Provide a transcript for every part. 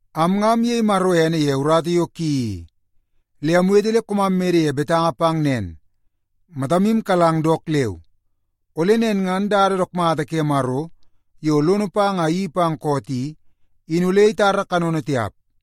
Am nga amyei Maro ene ye urata yo ki i, le amwete le koomam mede ye betanga pang nen, matamu kalang dook leu, ole nen ngan dada dook mata ke Maro yo lono pang a iyeii pang koot i, in ole itara kanono tiap.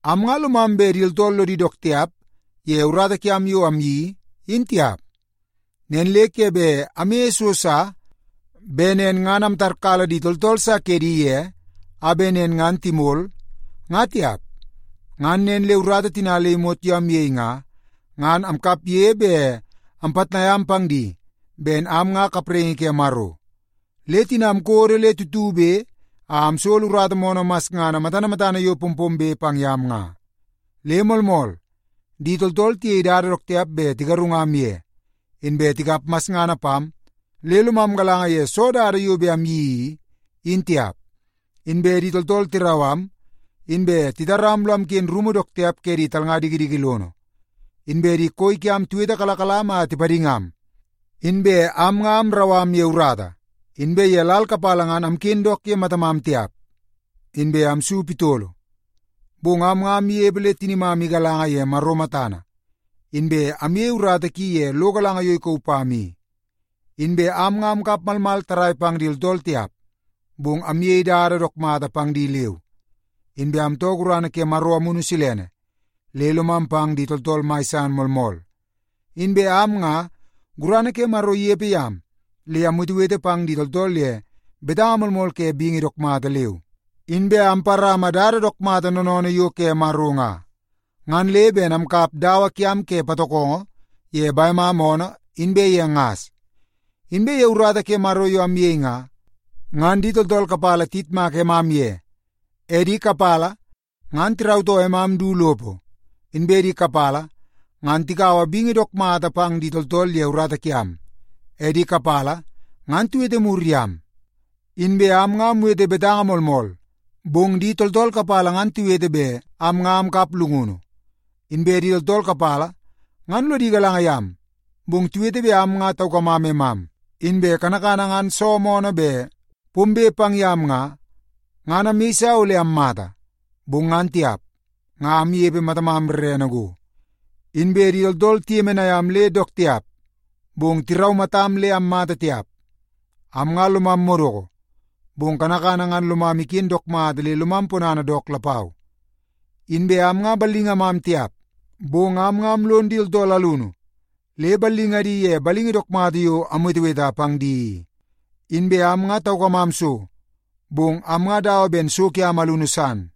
Am nga lomam bet di tooltool lodi dook tiap ye urata kiam yo amyeii, in tiap. Nen le ke bet amyeie so sa bet nen ngan amtarkala di tooltool sa kedi ye a bet nen ngan timol, nga tiap. Ngan nen le urata tina le imot yo amyei nga, ngan amkapge bet ampitnai am pang di ben am nga kapraingi ke Maro. Le tina amkodo le tutube a amsolo urata moonoo masngana matana matana yo pompombe pang yam nga. Le moolmool, di tooltool tiyei dada dook tiap bet tigarungam ye, inbe tikap masngana pam le lomam galanga ye soo dada yo bet amyeii i, in tiap. Inbe di tooltool tirau am, inbe titaram lo amken rumu dook tiap ke di talnga dikidiki lono. Inbe di koi kiam tiwetekalakalam a tipadingam. Inbe am nga amrau am ye urata, inbe ye lal kapala ngan amken dook ye matamam tiap, inbe amsu pitolo. Bong am nga amnepe le tinimam galanga ye Maro matana, inbe amyei urata ki ye lo galanga yo ikauu pam i. Inbe am nga amkap malmal tarrai pang di tooltool tiap, bong amyei dada dook mata pang di leu. Inbe amtoo gurana ke Maro Amunu Silene, le lomam pang di tooltool mai san moolmool. Inbe am nga, gurana ke Maro inepe yam le amwetewete pang di tooltool ye betanga moolmool ke bingi dook mata leu. Inbe amparama dada dook mata noonoonoo yo ke Maro nga, ngan le ben amkap dawa kiam ke patokongo ye bemam oonoo inbe ye ngas. Inbe ye urata ke Maro yo amyei nga, ngan di tooltool kapala tiyitmak emam ye, e di kapala ngan tirautoo emam du lopo, inbe di kapala ngan tikaua bingi dook mata pang di tooltool ye urata kiam, e di kapala ngan tiwete mur yam. Inbe am nga amwete betanga moolmool, bong di tooltool kapala ngan tiwete bet am nga amkap llungunu. Inbe di tooltool kapala ngan lodi galanga yam, bong tiwete bet am nga taukamam emam. Inbe kanakana ngan so moonoo bet pombe pang yam nga, ngan amyeisa ole ammata, bong ngan tiap, nga amnepe matamam rrene go. Inbe di tooltool tiyemenai am le dook tiap, bong tiraumatam le ammata tiap. Am nga lomam madoko, bong kanakana ngan lomam iken dook mata le lomam ponana dook lapau. Inbe am nga ballingamam tiap, bong am nga amlon di tooltool alunu le ballingadi ye bingi dook mata yo amweteweta pang di i. Inbe am nga taukamam so, bong am nga dawa ben so kiam alunu san.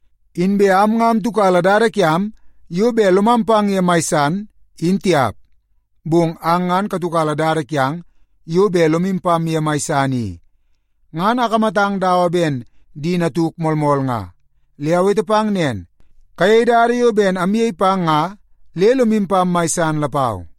Inbe am nga amtiukala dada kiam yo bet lomam pang ye mai san, in tiap, bong ang ngan la katiukala dada kiang yo bet lomu pam ye mai san i. Ngan akamatang dawa ben di natuk moolmool nga, le awete pang nen, kayei dada yo ben amyei pang nga le lomu pam mai san lapau.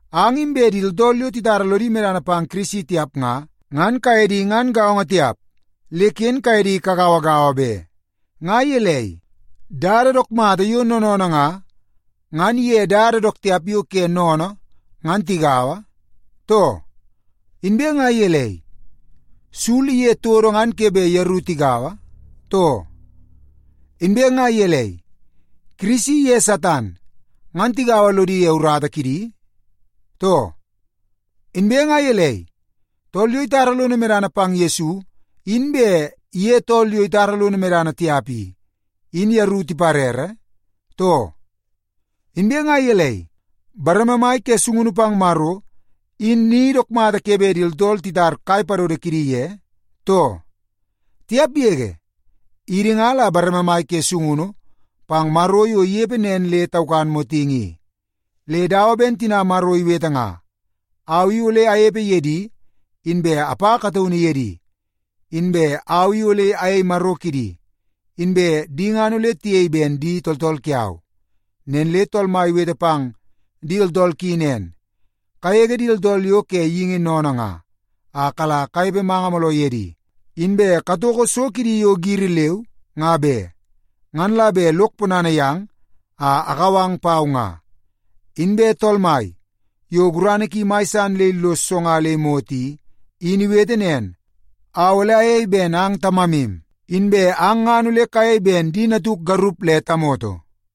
Ang inbe di tooltool yo titara lodi medana pang Kirisi tiap nga, ngan kaye di ngan gaongo tiap, le ken kaye di kagauagaua be. Nga gelei, dada dook mata yo noonoonoo nga, ngan iye dada dook tiap yo ke geingi sennene ngan tigaua, too? Inbe nga gelei, sul iye todo ngan ke bet yeru tigaua, too? Inbe nga gelei, Kirisi iye Satan ngan tigaua lodi ye urata kidi, too? Inbe nga gelei, tool yo itara lono medana pang Yesu in bet iye tool yo itara lono medana tiap i, in yeru tiparere, too? Inbe nga gelei, bareme mai ke sungunu pang Maro, in ni dook mata ke bet di tooltool titar kai padodo kidi ye, too? Tiap yege! Idi nga la bareme mai ke sungunu pang Maro yo inepe nen le taukan motingi i. Le dawa ben tina Maro iwete nga, “Au i ole anepe ye di, inbe apa kataunu ye di. Inbe au i ole ayei Maro kidi, inbe di ngan ole tiyei ben di tooltool kiau.” Nen le Tool Mai iwete pang di tooltool ki nen, “Kagege di tooltool yo ke geingi sennene nga, a kala kanepe manga mooloo ye di. Inbe katoko so kidi yo giri leu, nga be. Ngan la bet lok ponana yang a akau ang pau nga.” Inbe Tool Mai, yo gurana ki mai san le illos so nga le imot i, in iwete nen, “Au ole ayei ben ang Tamamu, inbe ang ngan ole kayei ben di natuk garup le tamoto.”